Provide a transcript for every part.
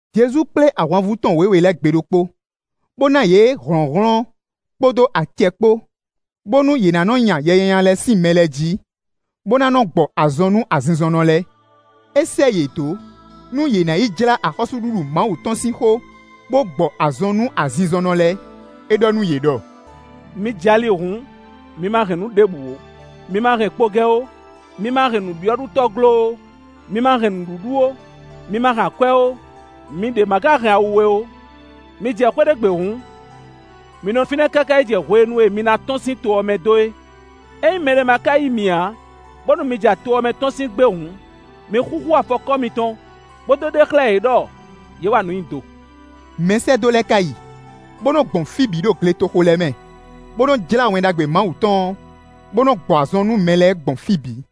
Jezu kplé ahwanvú tɔn wěwe lɛ́ɛ gbe ɖokpó, bó ná yě hlɔ̌nhlɔ́n kpódó acɛ kpó, bónú yě ná nɔ nya yɛ nyanya lɛ́ɛ sín mɛ lɛ́ɛ jí, bó ná nɔ́ gbɔ azɔn nú azinzɔnnɔ lɛ́ɛ. É sɛ́ yě dó, nú yě ná yi jlá axɔ́súɖuɖu Mawu tɔn sín xó, bó gbɔ azɔn nú azinzɔnnɔ lɛ́ɛ. É ɖɔ nú yě ɖɔ: “Mi jɛ ali hǔn, mi ma hɛn nǔ ɖěbǔ ó: mi ma hɛn kpogɛ ó, mi ma hɛn nǔbyɔ́ɖutɔ́ glo ó, mi ma hɛn nǔɖuɖu ó, mi ma hɛn akwɛ́ ó, mi ɖě ma ka hɛn awu we ó. Mi jɛ xwé ɖé gbe hǔn, mi nɔ fínɛ́ káká yi jɛ hwenu e mi na tɔ́n sín to ɔ́ mɛ dó é. Ényí mɛ lɛ́ɛ ma ka yí mi ǎ, bónú mi ja to ɔ́ mɛ tɔ́n sín gbe hǔn, mi xúxú afɔkɔ́ mitɔn, bó dó ɖe xlɛ́ yě ɖɔ yě wa nǔ nyi do.” Mɛsɛ́dó lɛ́ɛ ka yi, bó nɔ gbɔn fí bǐ ɖo gletoxo lɛ́ɛ mɛ, bó nɔ jlá Wɛn Ɖagbe Mawu tɔn ɔ́, bó nɔ gbɔ azɔn nú mɛ lɛ́ɛ gbɔn fí bǐ.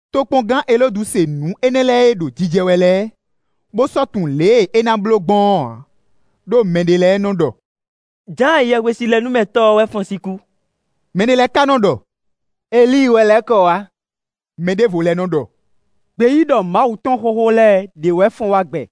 Tokpɔngán Elódu se nǔ énɛ́ lɛ́ɛ e ɖo jijɛ wɛ lɛ́ɛ, bó sɔ́ tunwun lě e é ná bló gbɔn ɔ́ ǎ, ɖó mɛ ɖé lɛ́ɛ nɔ ɖɔ: “Jǎan Yɛhwesinlɛnúmɛtɔ́ ɔ́ wɛ fɔ́n sín kú.” Mɛ ɖé lɛ́ɛ ka nɔ ɖɔ: “Elíi wɛ lɛ́ kɔ wá.” Mɛ ɖěvo lɛ́ɛ nɔ ɖɔ: “Gbeyíɖɔ Mawu tɔn xóxó lɛ́ɛ ɖě wɛ fɔ́n wá gbɛ.”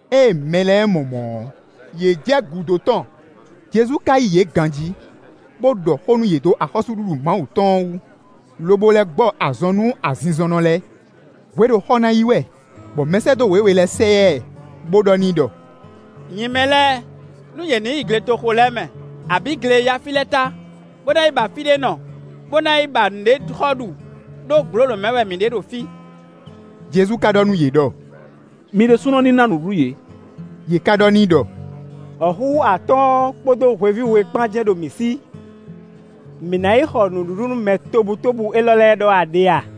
Ée mɛ lɛ́ɛ mɔ mɔ̌ ɔ́, yě jɛ gúdo tɔn. Jezu ka yí yě ganjí, bó ɖɔ xó nú yě dó axɔ́súɖuɖu Mawu tɔn ɔ́ wú, lobo lɛ́ gbɔ azɔn nú azinzɔnnɔ lɛ́ɛ. Hwe ɖo xɔ na yi wɛ, bɔ mɛsɛ́dó wěwe lɛ́ɛ sɛ yá ɛ, bó ɖɔ n'i ɖɔ: “Nyi mɛ lɛ́ɛ, nú yě ní yi gletoxo lɛ́ɛ mɛ, abǐ gle e yá fí lɛ́ɛ é ta, bó na yi ba fí ɖé nɔ, bó na yi ba nǔɖé xɔ ɖu, ɖó gblǒlǒ mɛ wɛ mì ɖe ɖo fí.” Jezu ka ɖɔ nú yě ɖɔ: “Mi ɖésúnɔ ní ná nǔɖuɖu yě.” Yě ká ɖɔ n'i ɖɔ: “Wɔ̌xúxú atɔ́ɔ́n kpódó hweví we kpán jɛ́n ɖo mǐ sí. Mǐ ná yi xɔ nǔɖuɖu nú mɛ tobutóbú élɔ́ lɛ́ɛ ɖɔ wɛ a ɖe a?”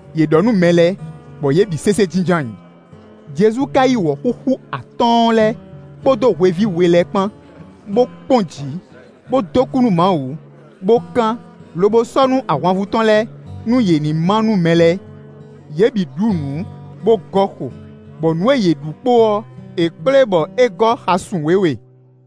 Yě ɖɔ nú mɛ lɛ́ɛ bɔ yě bǐ sésé jínjɔ́n ayǐ. Jezu ka yí wɔ̌xúxú atɔ́ɔ́n lɛ́ɛ kpódó hweví we lɛ́ɛ kpán, bó kpɔ́n jǐ, bó dó kú nú Mawu, bó kán, lobo sɔ́ nú ahwanvú tɔn lɛ́ɛ, nú yě ní má nú mɛ lɛ́ɛ. Yě bǐ ɖu nǔ, bó gɔ́ xo, bɔ nǔ e yě ɖu kpo ɔ́, è kplé bɔ é gɔ́ xasun wěwe.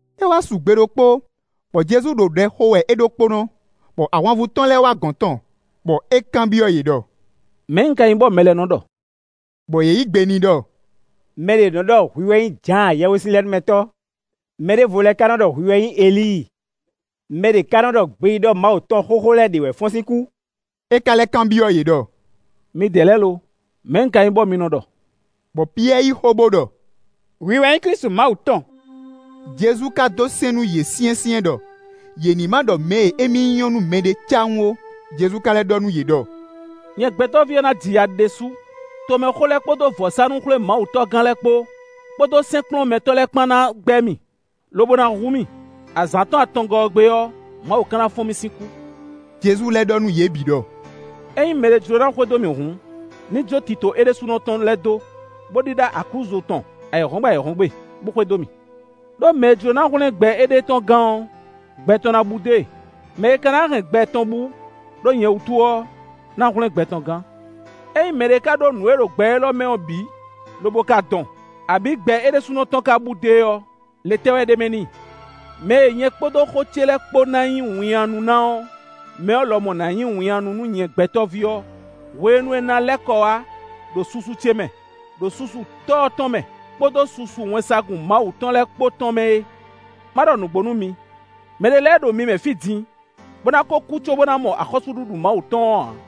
É wá su gbe ɖokpó, bɔ Jezu ɖo ɖɛ xo wɛ é ɖokpónɔ, bɔ ahwanvú tɔn lɛ́ɛ wá gɔ̌n tɔn, bɔ é kanbyɔ́ yě ɖɔ: “Mɛ̌ un ka nyí bɔ mɛ lɛ́ɛ nɔ ɖɔ?” Bɔ yě yí gbe n'i ɖɔ: “Mɛ ɖě nɔ ɖɔ hwi wɛ nyí Jǎan Yɛhwesinlɛnúmɛtɔ́, mɛ ɖěvo lɛ́ɛ ka nɔ ɖɔ hwi wɛ nyí Elíi, mɛ ɖě ká nɔ ɖɔ gbeyíɖɔ Mawu tɔn xóxó lɛ́ɛ ɖě wɛ fɔ́n sín kú.” É ka lɛ́ kanbyɔ́ yě ɖɔ: “Midɛɛ lɛ́ɛ lo, mɛ̌ un ka nyí bɔ mi nɔ ɖɔ?” Bɔ Piyɛ́ɛ yí xó bó ɖɔ: “Hwi wɛ nyí Klísu Mawu tɔn.” Jezu ka dó sɛ́n nú yě syɛ́nsyɛ́n ɖɔ yě ní ma ɖɔ mɛ e émí nyí ɔ́ nú mɛɖé cáwún ó. Jezu ka lɛ́ ɖɔ nú yě ɖɔ: “Nyɛ Gbɛtɔ́ví ɔ́ ná ji ya ɖésú; tomɛxó lɛ́ɛ kpódó vɔ̌sánú-xwlémawutɔ́gán lɛ́ɛ kpó, kpódó sɛ́nkplɔ́nmɛtɔ́ lɛ́ɛ kpán ná gbɛ́ mì, lobo ná hu mì. Azǎn tɔn atɔngɔ́ ɔ́ gbe ɔ́, Mawu ka ná fɔ́n mì sín kú.” Jezu lɛ́ ɖɔ nú yě bǐ ɖɔ: “Ényí mɛɖé jló ná xwedó mì hǔn, ní jó tito é ɖésúnɔ tɔn lɛ́ɛ dó, bó ɖíɖá aklúzu tɔn ayǐhɔ́ngbe ayǐhɔ́ngbe, bó xwedó mì. Đó mɛ e jló ná hwlɛ́n gbɛ éɖée tɔn gán ɔ́, gbɛ tɔn ná bú dó e; mɛ e ka ná hɛn gbɛ tɔn bú ɖó nyɛ wútu ɔ́ ná hwlɛ́n gbɛ tɔn gán. Ényí mɛɖé ka ɖó nǔ e ɖo gbɛ élɔ́ mɛ ɔ́ bǐ, lobo ka dɔn, abǐ gbɛ é ɖésúnɔ tɔn ka bú dó e ɔ́, le tɛ́ wɛ ɖ'é mɛ n'i? Mɛ e nyɛ kpódó xó ce lɛ́ɛ kpó ná nyí winnyánú ná ɔ́, mɛ ɔ́ lɔmɔ̌ ná nyí winnyánú nú nyɛ Gbɛtɔ́ví ɔ́ hwenu e un ná lɛ́ kɔ wá ɖo susu ce mɛ, ɖo susu Tɔ́ ɔ́ tɔn mɛ, kpódó susu wɛnsagun Mawu tɔn lɛ́ɛ kpó tɔn mɛ é. Má ɖɔ nǔgbó nú mi: mɛ ɖé lɛ́ɛ ɖo mi mɛ fí din, bó ná kó kú cóbó ná mɔ axɔ́súɖuɖu Mawu tɔn ɔ́ ǎ.”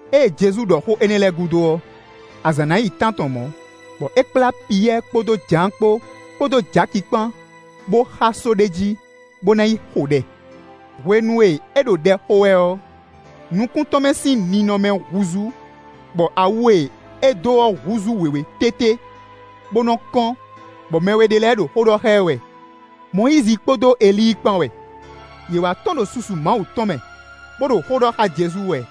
Ée Jezu ɖɔ xó énɛ́ lɛ́ɛ gúdo ɔ́, azǎn ná yi tántɔn mɔ̌, bɔ é kplá Piyɛ́ɛ kpódó Jǎan kpó, kpódó Jaki kpán, bó xá só ɖé jí, bó ná yi xo ɖɛ. Hwenu e é ɖo ɖɛ xo wɛ ɔ́, nukún tɔn mɛ sín ninɔmɛ húzú, bɔ awu e é dó ɔ́ húzú wěwé tété, bó nɔ kɔ́n, bɔ mɛ we ɖé lɛ́ɛ ɖo xó ɖɔ xá ɛ wɛ: Mɔyízi kpódó Elíi kpán wɛ. Yě wá tɔ́n ɖo susu Mawu tɔn mɛ, bó ɖo xó ɖɔ xá Jezu wɛ,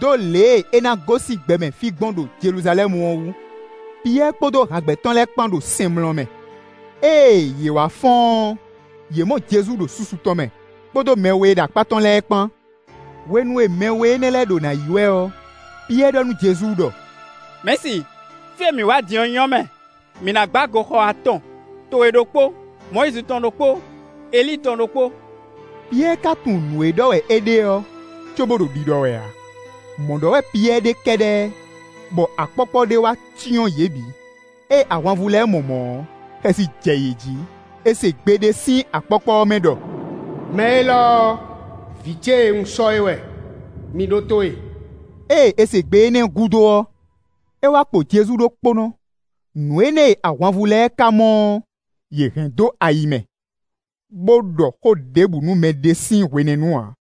dó lě e é ná gosín gbɛmɛ fí gbɔn ɖo Jeluzalɛ́mu ɔ́ wú. Piyɛ́ɛ kpódó hǎgbɛ́ tɔn lɛ́ɛ kpán ɖo sɛnmlɔ mɛ; ée yě wá fɔ́n ɔ́, yě mɔ Jezu ɖo susu tɔn mɛ, kpódó mɛ we e ɖo akpá tɔn lɛ́ɛ kpán. Hwenu e mɛ we énɛ́ lɛ́ɛ ɖo nǎ yi wɛ ɔ́, Piyɛ́ɛ ɖɔ nú Jezu ɖɔ: “Mɛ̌si, fí e mǐ wá din ɔ́ nyɔ́ mɛ! Mǐ ná gbá goxɔ atɔn: towe ɖokpó, Mɔyízi tɔn ɖokpó, Elíi tɔn ɖokpó.” Piyɛ́ɛ ka tunwun nǔ e ɖɔ wɛ é ɖe ɔ́, cóbó ɖo ɖiɖɔ wɛ ǎ. Mɔ̌ ɖɔ wɛ Piyɛ́ɛ ɖe kɛ́ɖɛ́ bɔ akpɔ́kpɔ́ ɖé wá cyɔ́n yě bǐ; ée ahwanvú lɛ́ɛ mɔ mɔ̌ ɔ́, xɛsi jɛ yě jí. È se gbe ɖé sín akpɔ́kpɔ́ ɔ́ mɛ ɖɔ: “Mɛ élɔ́ ɔ́, vǐ ce e un sɔ́ é wɛ; mi ɖótó e.” Ée è se gbe énɛ́ gúdo ɔ́, é wá kpo Jezu ɖokpónɔ. Nǔ énɛ́ e ahwanvú lɛ́ɛ ka mɔ ɔ́, yě hɛn dó ayi mɛ, bó ɖɔ xó ɖěbǔ nú mɛ ɖé sín hwenɛ́nu ǎ.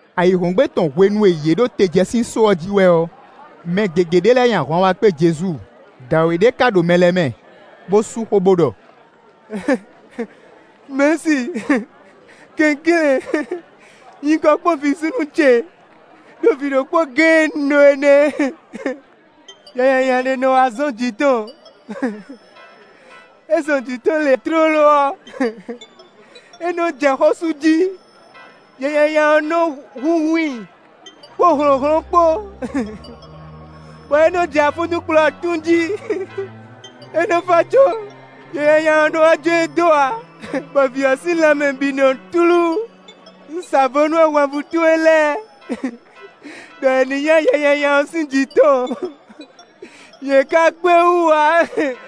Ayǐhɔ́ngbe tɔn hwenu e yě ɖo te jɛ sín só ɔ́ jí wɛ ɔ́, mɛ gěgé ɖé lɛ́ɛ nyi ahwan wá kpé Jezu. Dǎwe ɖé ká ɖo mɛ lɛ́ɛ mɛ, bó sú xó bó ɖɔ: “Mɛ̌si, kɛnklɛ́n, nyi kɔ kpɔ́n vǐ súnnu ce, ɖó vǐ ɖokpó géé e un ɖó ɔ́ nɛ́. Yɛ nyanya ɖé nɔ wá zɔn jǐ tɔn; é zɔn jǐ tɔn lě tlóló ɔ́, é nɔ́ jɛ xó sú jí; yɛ nyanya ɔ́ nɔ húnhún i kpódó hlɔ̌nhlɔ́n kpó, bɔ é nɔ́ jɛ afúntúnkplɔ̌ tún jí. É nɔ́ fá cóbɔ yɛ nyanya ɔ́ nɔ́ wá jó e dó ǎ, bɔ vǐ ɔ́ sín lanmɛ bǐ nɔ túlú. Un sa vo nú ahwanvú towe lɛ́ɛ ɖɔ yě ní nya yɛ nyanya ɔ́ sín jǐ tɔn; yě ká kpé wú ǎ.”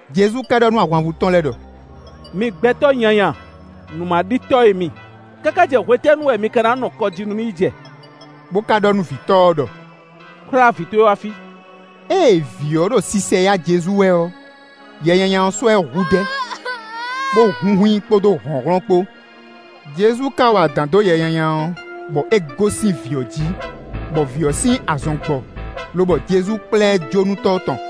Jezu ka ɖɔ nú ahwanvú tɔn lɛ́ɛ ɖɔ: “Mi gbɛtɔ́ nyanya, nǔmaɖitɔ́ e mi, káká jɛ hwetɛ́nu wɛ mi ka ná nɔ kɔ jí nú mì yi jɛ?” Bo ka ɖɔ nú vǐtɔ́ ɔ́ ɖɔ: “Kplá vǐ towe wá fí.” Ée vǐ ɔ́ ɖo sisɛyá Jezu wɛ ɔ́, yɛ nyanya ɔ́ sɔ́ ɛ hudɛ́, bó hunhun i kpódó hlɔ̌nhlɔ́n kpó. Jezu ka wa adǎn dó yɛ nyanya ɔ́, bɔ é gosín vǐ ɔ́ jí, bɔ vǐ ɔ́ sín azɔn gbɔ, lobɔ Jezu kplá ɛ jó nú tɔ́ tɔn.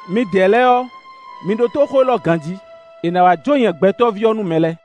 “Midɛɛ lɛ́ɛ ɔ́, mi ɖótó xó élɔ́ ganjí: è nǎ wá jó nyɛ Gbɛtɔ́ví ɔ́ nú mɛ lɛ́ɛ.”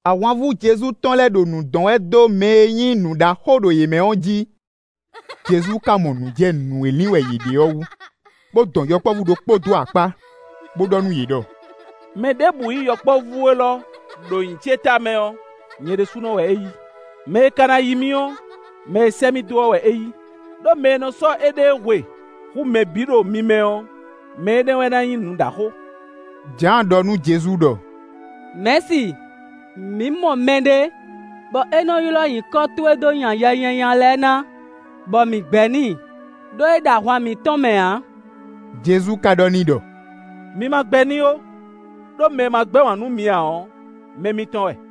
Ahwanvú Jezu tɔn lɛ́ɛ ɖo nǔ dɔn wɛ dó mɛ e nyí nǔ ɖaxó ɖo yě mɛ ɔ́ jí. Jezu ka mɔ nǔ jɛ nǔ e lin wɛ yě ɖe ɔ́ wú, bó dɔn yɔkpɔ́vú ɖokpó dó akpá, bó ɖɔ nú yě ɖɔ: “Mɛ ɖěbǔ yí yɔkpɔ́vú élɔ́ ɖo nyǐ ce tamɛ ɔ́, nyɛ ɖésúnɔ wɛ é yí. Mɛ e ka yí mì ɔ́, mɛ e sɛ́ mì dó ɔ́ wɛ é yí; ɖó mɛ e nɔ sɔ́ éɖée hwe hú mɛ bǐ ɖo mi mɛ ɔ́, mɛ énɛ́ wɛ ná nyí nǔɖaxó.” Jǎan ɖɔ nú Jezu ɖɔ: “Mɛ̌si, mǐ mɔ mɛɖé, bɔ é nɔ́ ylɔ́ nyǐkɔ towe dó nya yɛ nyanya lɛ́ɛ ná, bɔ mǐ gbɛ́ n'i, ɖó é ɖo ahwan mǐtɔn mɛ ǎ.” Jezu ka ɖɔ n'i ɖɔ: “Mi ma gbɛ́ n'i ó, ɖó mɛ e ma gbɛ́ wǎn nú mi ǎ ɔ́, mɛ mitɔn wɛ.”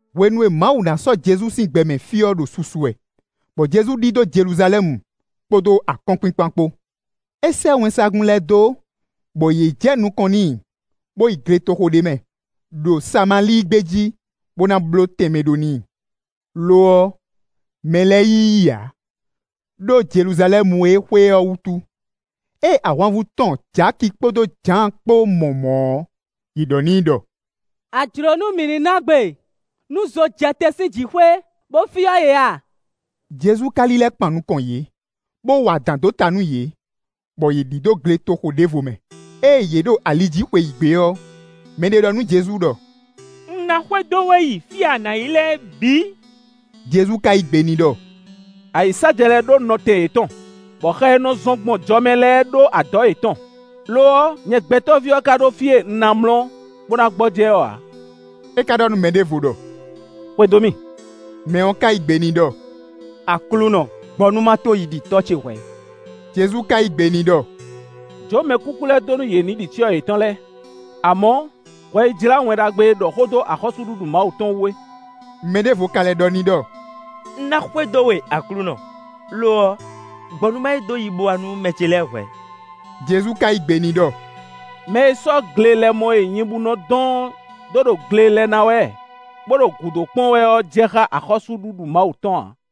Hwenu e Mawu na sɔ́ Jezu sín gbɛmɛ fí ɔ́ ɖo susu wɛ, bɔ Jezu ɖidó Jeluzalɛ́mu, kpódó akɔ́nkpinkpan kpó. É sɛ́ wɛnsagun lɛ́ɛ dó bɔ yě jɛ nukɔn n'i, bó yi gletoxo ɖé mɛ, ɖo Samalíi gbé jí, bó na bló tɛnmɛ ɖó n'i. Lo ɔ́, mɛ lɛ́ɛ yí i ǎ, ɖó Jeluzalɛ́mu e é xwe ɔ́ wútu. Ée ahwanvú tɔn Jaki kpódó Jǎan kpó mɔ mɔ̌ ɔ́, yě ɖɔ n'i ɖɔ: “A jlǒ nú mǐ ní ná gbe nú zo jɛ te sín jǐxwé, bó fyɔ́ yě a?” Jezu ka lílɛ́ kpan nukɔn yě, bó wa adǎn dó ta nú yě, bɔ yě ɖidó gletoxo ɖěvo mɛ. Ée yě ɖo ali jí xweyǐgbe ɔ́, mɛɖé ɖɔ nú Jezu ɖɔ: “Un ná xwedó we yi fí e a na yi lɛ́ɛ bǐ.” Jezu ka yí gbe n'i ɖɔ: “Ayǐsájɛ lɛ́ɛ ɖó nɔtɛn yětɔn, bɔ xɛ e nɔ zɔn gbɔn jɔ mɛ lɛ́ɛ ɖó adɔ̌ yětɔn; lo ɔ́, nyɛ Gbɛtɔ́ví ɔ́ ka ɖó fí e un ná mlɔ́, bó ná gbɔjɛ́ ɔ́ ǎ.” É ka ɖɔ nú mɛ ɖěvo ɖɔ: “Xwedó mì.” Mɛ ɔ́ ka yí gbe n'i ɖɔ: “Aklúnɔ, gbɔ nú ma tó yi ɖi tɔ́ ce hwɛ̌.” Jezu ka yí gbe n'i ɖɔ: “Jǒ mɛkúkú lɛ́ɛ dó nú yě ní ɖi cyɔ yětɔn lɛ́ɛ. Amɔ̌, hwɛ yi jlá Wɛn Ɖagbe e ɖɔ xó dó axɔ́súɖuɖu Mawu tɔn wú é.” Mɛ ɖěvo ka lɛ́ ɖɔ n'i ɖɔ: “Un ná xwedó we Aklúnɔ; lo ɔ́, gbɔ nú ma yi dó yibowá nú mɛ ce lɛ́ɛ hwɛ̌.” Jezu ka yí gbe n'i ɖɔ: “Mɛ e sɔ́ glelɛmɔ e nyibú nɔ dɔn ɔ́ dó ɖo gle lɛ ná wɛ, bó ɖo gǔdo kpɔ́n wɛ ɔ́ jɛ xá axɔ́súɖuɖu Mawu tɔn ǎ.”